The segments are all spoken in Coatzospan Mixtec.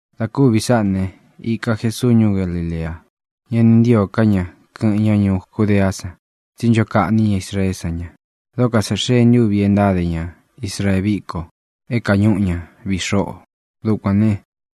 Dā kúvī sáꞌā ne, īka Jesuu ñuú Galilea. Ñá ni ntīo ká ña kɨ̄ꞌɨn ña ñuú Judeá san, tsí ncho kaꞌní ña Israeé san ña. Dóko sā xee ntúvi e ntáde ña Israee víko é kāñúꞌu ña viꞌi xoꞌo. Dukuān ne,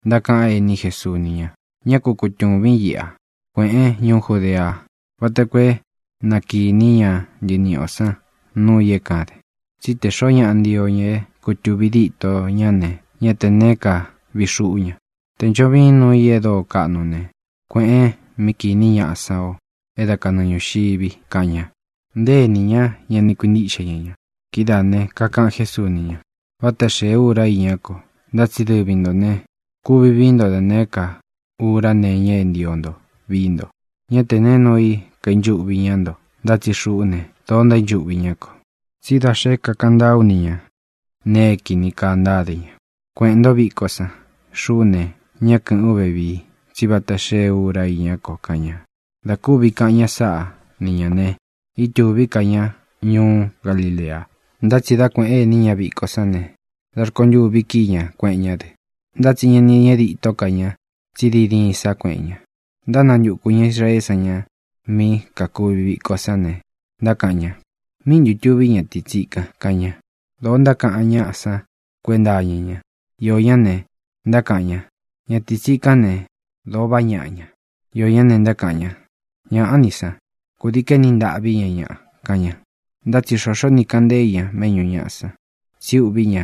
ntákaꞌan éní Jesuu ni ña: —Ñá ku kutūvín iꞌa. Kuēꞌén ñuú Judea vata koo é na kīní ña ntɨniꞌi ō san núu ī é kaden. Tsí te xōo ñáꞌa ntio ña é kutuvī ditó ña ne, ñá tē neé ka vii xuꞌú ña. Tē ncho viin nuu i e dóo kaꞌnu ne, kuēꞌen mí kīní ñaꞌa san o é da kanɨɨ ñūxivi —kaꞌan ña. Nté enī ñá ña ni kuintíꞌxe ña ña. Kidáā ne, kakaꞌan Jésuu ni ña: —Váta xēe ura iñá ko, ntá tsi dɨvi ntō ne, kuvi vií nto da nēé ka ura nee iña é ntio nto vii nto. Ñá te nēe nuu i kainchuꞌvi ñáꞌa nto. Ntá tsi xuꞌú ne, dōo ntaínchuꞌvi ñá ko, tsí da xé kakaꞌan ntáa ú ni ñā nee é kīni kaa ntáde ña. Kueꞌēn ntó viko san. Xuꞌú ne, ñá kɨ̄ꞌɨ́n u vevii, tsí vata xee úra iñá ko —kaꞌan ña. Dā kúvi kaꞌan ña sáꞌa ni ñā ne, ítūví ka ña ñuú Galilea. Ntá tsi dā kueꞌen éní ña viko sán ne, da rkontûvi kíi ña, kueꞌen ñá dɨ. Ntá tsi ña ni ñeꞌe ditó ka ña, tsí diin diin sá kueꞌen ña. Ntánantukū ña Israeé san ña mí kakuvi viko sán ne, ntákaꞌan ña: —¿Míꞌi ntū tuví ñatīi tsíkan? —kaꞌan ña. Dōo ntákaꞌan ñáꞌa san kuénta iña ña. Iō ñá ne, ntákaꞌan ña: “Ñatīi tsikán ne, dōo vaꞌá ñaꞌa ña.” Iō ñá ne, ntákaꞌan ña: “Ñaꞌá ni san. Kūdii kaéni ntaꞌví ña ñaꞌa”, kaꞌan ña. Ntá tsi xoxó ni kāꞌan ntée i ñā méꞌñu ñāꞌa san, tsí uꞌví ña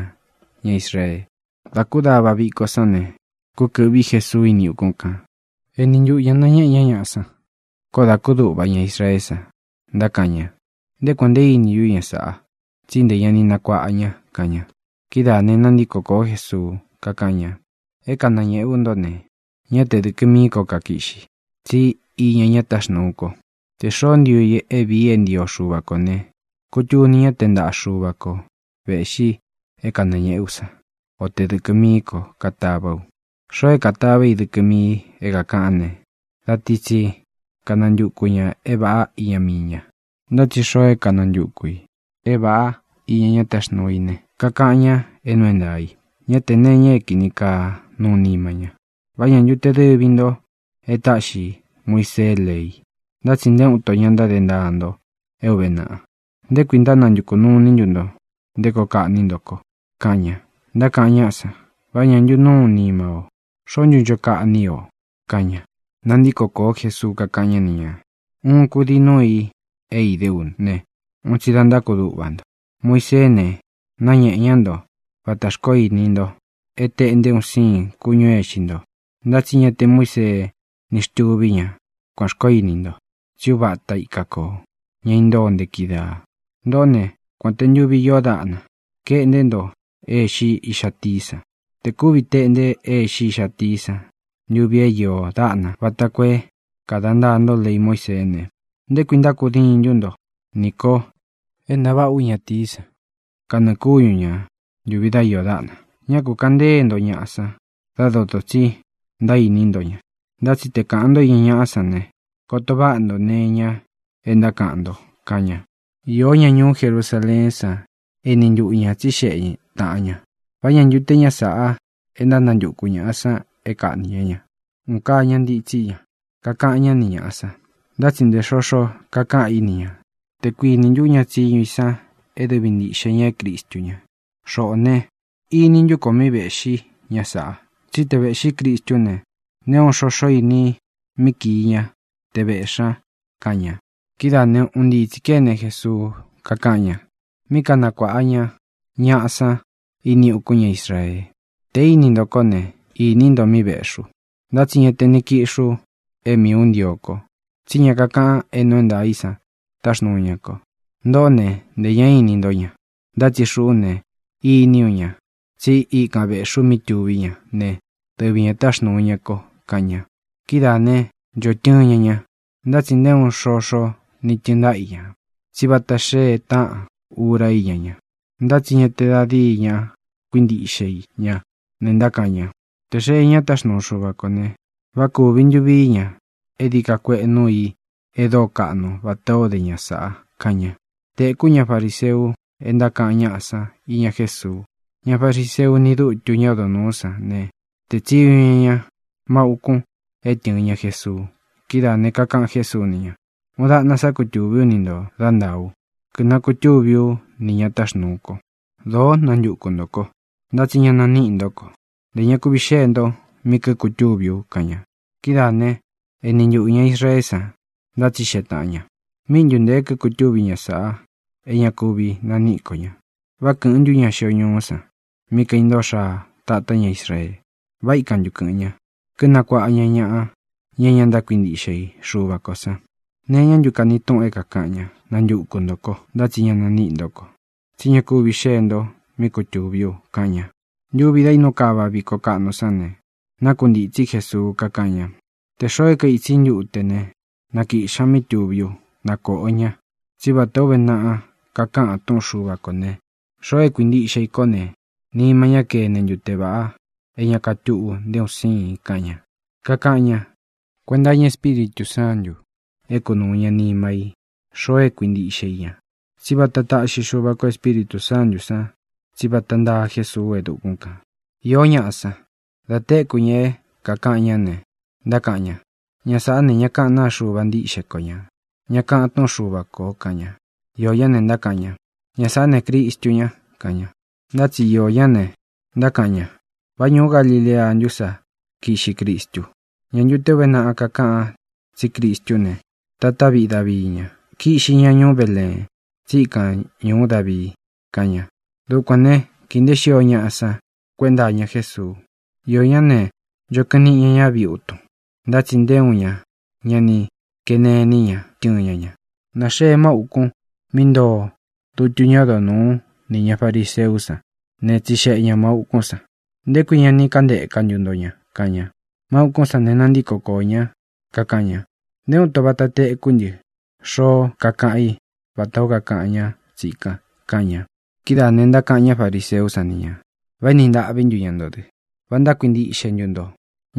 ña Israee. Dā kúdava viko sán ne, kúkɨ̄ꞌví Jesuu íni ukún kan, eni ntuꞌu ñā nañéꞌe ñá ñaꞌa san. Koó dā kúduꞌva ña Israeé san, ntákaꞌan ña: —¿Nté kuān nte íni ntú ña sāꞌa? Tsí ntē ña ni nakuáꞌa ña —kaꞌan ña. Kidáā ne, nantíko kōó Jesuu, kakáꞌan ña: —É kanañēꞌé u ntó ne, ñá te dɨ̄kɨ mií ko kakiꞌxi, tsí iña ña táxnuu ko. Tē xoó ntio i é viī i é ntio Xuva kō ne, kutuni ñá te ntaꞌa Xuva ko vēꞌxi é kanañēꞌé u san, o te dɨkɨ mií ko katavá u. Xoo é katavá i dɨkɨ mií i é kākaꞌán ne, da ti tsi kanantuku ñā é vāꞌá iña mii ña. Ntá tsi xoo é kanantuku ī é vāꞌá iña ña táxnuu i ne, kakaꞌan ña é nuu é ntaā i. Ñá tē nee iña é kīni kaa nuu nima ña. ʼ¿Vá ña ntu te dɨvi ntō e táꞌxi Muisee lei? Ntá tsi nté uun nto ña ntáde ntaa nto é ūve naꞌa. ¿Nté kui ntánantukū nuu iní ntu nto nté koo kaꞌní nto ko? —kaꞌan ña. Ntákaꞌan ñáꞌa san: —¡Vá ña váꞌa ntu nuu nima o! ¿Xoó ntu ncho kaꞌní i o? —kaꞌan ña. Nantíko kōó Jesuu, kakáꞌan ñá ni ñā: —Uun kudii núu i é idé u ne, un tsi da ntákuduꞌva nto. Muiseé ne, náñēꞌe ñá nto vatā xkoó ini nto é tēꞌnté un siin kúñū é īxi nto. (Ntá tsi ña te Muísee ni xtuví ña kuān xkoó ini nto, tsí uva ata ika kō, ña intóo nte kidaa.) Ntōꞌó ne, kuān te ntuvi íō dáꞌna, kaeꞌnté nto é īxi íꞌxa tií san. Tē kuvi teꞌnte é īxi íꞌxa tií san ntuvi é iō dáꞌna vata koo é kāda ntaa nto lei Muíseé ne, ¿nté kui ntákudiin ntu nto ní ko e ntaváꞌa ú ñatīí san kanɨɨ̄ kúñu ñā ntuvi dá iō dáꞌna? Ñá ku kāꞌan ntée nto ñaꞌa san dá dotō tsí ntaíni nto ña, ntá tsí te kāꞌan ntó iña ñaꞌá san ne, koto váꞌa nto nee iña é ntákaꞌan nto —kaꞌan ña. Īó ña ñuú Jerusaleén san éni ntuꞌu ñā tsíxeꞌe taꞌan ñā: —¿Vá ña ntu te ñá sāꞌa é ntánantuku ñāꞌa san é kaꞌnī ñá ña? Un kaa ña ntitsi ña, kakaꞌan ñá ni ñāꞌa san, ntá tsi nté xoxo kakaꞌan í ni ñā. ¿Tē kuiní ntu ña tsiñu i san é dɨvi ntīꞌxe ña é Cristu ña? Xoꞌō ne, ini ntú ku ō míꞌi vēꞌxí ña sāꞌa. Tsí te vēꞌxí Cristú ne, nté uun xoxó ini i míꞌi kii ña te vēꞌxí ña —kaꞌan ña. Kidáā ne, un ntii tsī kéne Jesuu, kakáꞌan ña mí kanakuāꞌa ña ñaꞌa san ini ukún ña Israee: —Te īni ntó ko ne, ini nto míꞌi vēꞌxí u. Ntá tsi ña te ni kiꞌxí u é miī ú ntio ko, tsí ña kakaꞌan é nuu é ntaā i san táxnūu ña ko. Ntoꞌó ne, ntē ñá ini ntó ña. Ntá tsi xuꞌú ne, iní u ña, tsi íkan vēꞌxí u mí tuví ña ne, dɨvi ñā e táxnūu ña ko —kaꞌan ña. Kidáā né, ncho tɨɨn ña ña, ntá tsi nté uun xoxo ni tɨɨn ntáꞌa i ña, tsí vata xee táꞌan ura íña ña. Ntá tsi ña te da díi ña kuíntiꞌxe i ña ne, ntákaꞌan ña: —Tē xee ñá táxnuu Xuva kō ne, ¿vá kūvi ntu vií ña e dií ka kueꞌe núu ī e dóo kaꞌnu vatā ó de ña sāꞌa? —kaꞌan ña. Tēkú ña fariseu e ntákaꞌan ñáꞌa san íña Jésuu. Ña fariseu ni dútu ñá odo nūú san ne, tēé tsiñu ña ña mau ukun é tɨ̄ɨn ña Jesuu. Kidáā ne, kakaꞌan Jésuu ni ña: —Uun daꞌna sá kutūví u ni ntō dá ntāa ú, kínakutúvi ú nī ña táxnūu ko. Dōó nantuku ntō ko, ntá tsi ña naníꞌi ntó ko. Ntē ña kuvi xée nto mí kíkutúvi u —kaꞌan ña. Kidáā né, ēni ntuꞌu ña Israeé san ntátsixeꞌe taꞌan ñā: —¿Míꞌi ntu ntēe kíkutúvi ña sāꞌa é ña kuvi naníꞌi ko ña? ¿Vá kɨ̄ꞌɨn ntú ña xio ñuú san mí kaintóo xaa tātá ña Israeé? ¿Vá ikan ntu kɨ̄ꞌɨn ña, kinakuáꞌa ña ñaꞌa, ña é ña ntákuintiꞌxe i Xuva kō san? ¿Nee iñá ntu kani túꞌun é kākaꞌan ña: “Nantuku ntō kó, ntá tsi ña naníꞌi ntó ko, tsi ña kúvi xēe nto mí kutūví u”? —kaꞌan ña. Ntuvi da īnú kava viko kaꞌnu sán ne, nákuntītsí Jesuu, kakáꞌan ña: —Tē xoo é kaitsi i ntúte ne, na kīꞌxi ña mí tuví u, na kōꞌo ña. Tsí vatā ó uve naꞌa kakaꞌan Túꞌun Xuva kō ne, xoo é kuintiꞌxe i kó ne, nima ñá kene ntute vāꞌa é ña katúꞌu nté un síin —kaꞌan ña. Kakaꞌan ñá kuenta iña Espíritū Sántū é kunūu ña nima í xoo é kuintíꞌxe i ña. Tsí vata taꞌxi Xúva kō Espíritū Sántū san, tsí vata ntáa Jesuu e dukún kān. Īó ñaꞌa san, da téku ña é kākaꞌan ñá ne, ntákaꞌan ña: —Ña sāꞌá ne, ña kaꞌán naa Xuva ntíꞌxe ko ñā, ña kakaꞌan túꞌun Xuva kō —kaꞌan ña. Iō ñá ne, ntákaꞌan ña: —Ña sāꞌá ne, Cristu ña —kaꞌan ña. Ntá tsi iō ñá ne, ntákaꞌan ña: —¿Vá ñūú Galilea ntú sa kiꞌxi Cristu? ¿Ñā ntu te uve náꞌa kakáꞌan tsí Cristú ne, tatá viꞌi Davii ña? Kiꞌxi ña ñuú Beleen, tsí ikan ñūú Davii —kaꞌan ña. Dukuān ne, kii nteé xio ñaꞌa san kuénta iña Jésuu. Iō ñá ne, ncho kɨꞌɨn niꞌi ñá ña viutun, ntá tsi nté uun ña ña ni kene iní ña tɨ́ɨn ña ñā. Nāxee mau ukun mí ntoo dutu ñá odo nūú nī ña fariseú san ne, tsixeꞌe ña māu ukún san: —¿Nté kui ña ni kántēka ntu nto ña? —kaꞌan ña. Máu ūkún san ne, nantíko koō ñá, kakaꞌan ña: —Nté uun ito vata tekú ntɨ xoó kakaꞌan í vatā ó kakaꞌan ñá tsikan —kaꞌan ña. Kidáā ne, ntákaꞌan ñá fariseú san ni nā: —¿Vá éni ntaꞌví ntu ña nto dɨ? ¿Vá ntákuintiꞌxe ntu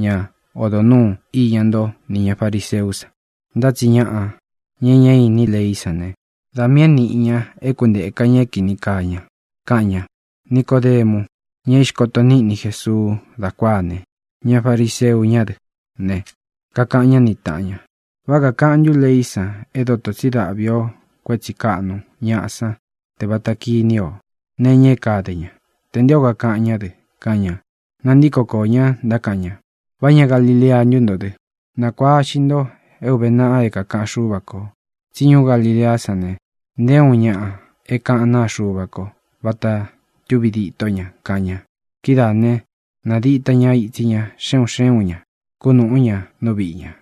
ña odo nūú iña nto nī ña fariseú san? Ntá tsi ñaꞌa, ña e ñá īní leí san ne, da miī é nīꞌi ña é kuntēka é kīni kaa ña —kaꞌan ña. Nicodemu, ña é ixkoto níꞌni Jesuu dá kuáā ne, ña fariseu ñá dɨ ne, kakaꞌan ñá ni tāꞌan ña: —¿Vá kakaꞌan ntu leí san é dotō tsi dáꞌvi o kuētsí kaꞌnu ñaꞌa san te vata kiní o nee iña é kade ña, tē nté ō kakaꞌan ñá dɨ? —kaꞌan ña. Nantíko koō ñá, ntákaꞌan ña: —¿Vá ña Galilea ntú nto dɨ? Nākuaꞌa ixi nto é ūve naꞌa é kākaꞌan Xúva kō, tsí ñuú Galileá san ne, nté uun ñaꞌa é kaꞌán naa Xuva ko vata túvi ditó ña —kaꞌan ña. Kidáā né, nādita ña itsi ña xe un xé un ñā, kunúꞌu ñā nú viꞌi ñā.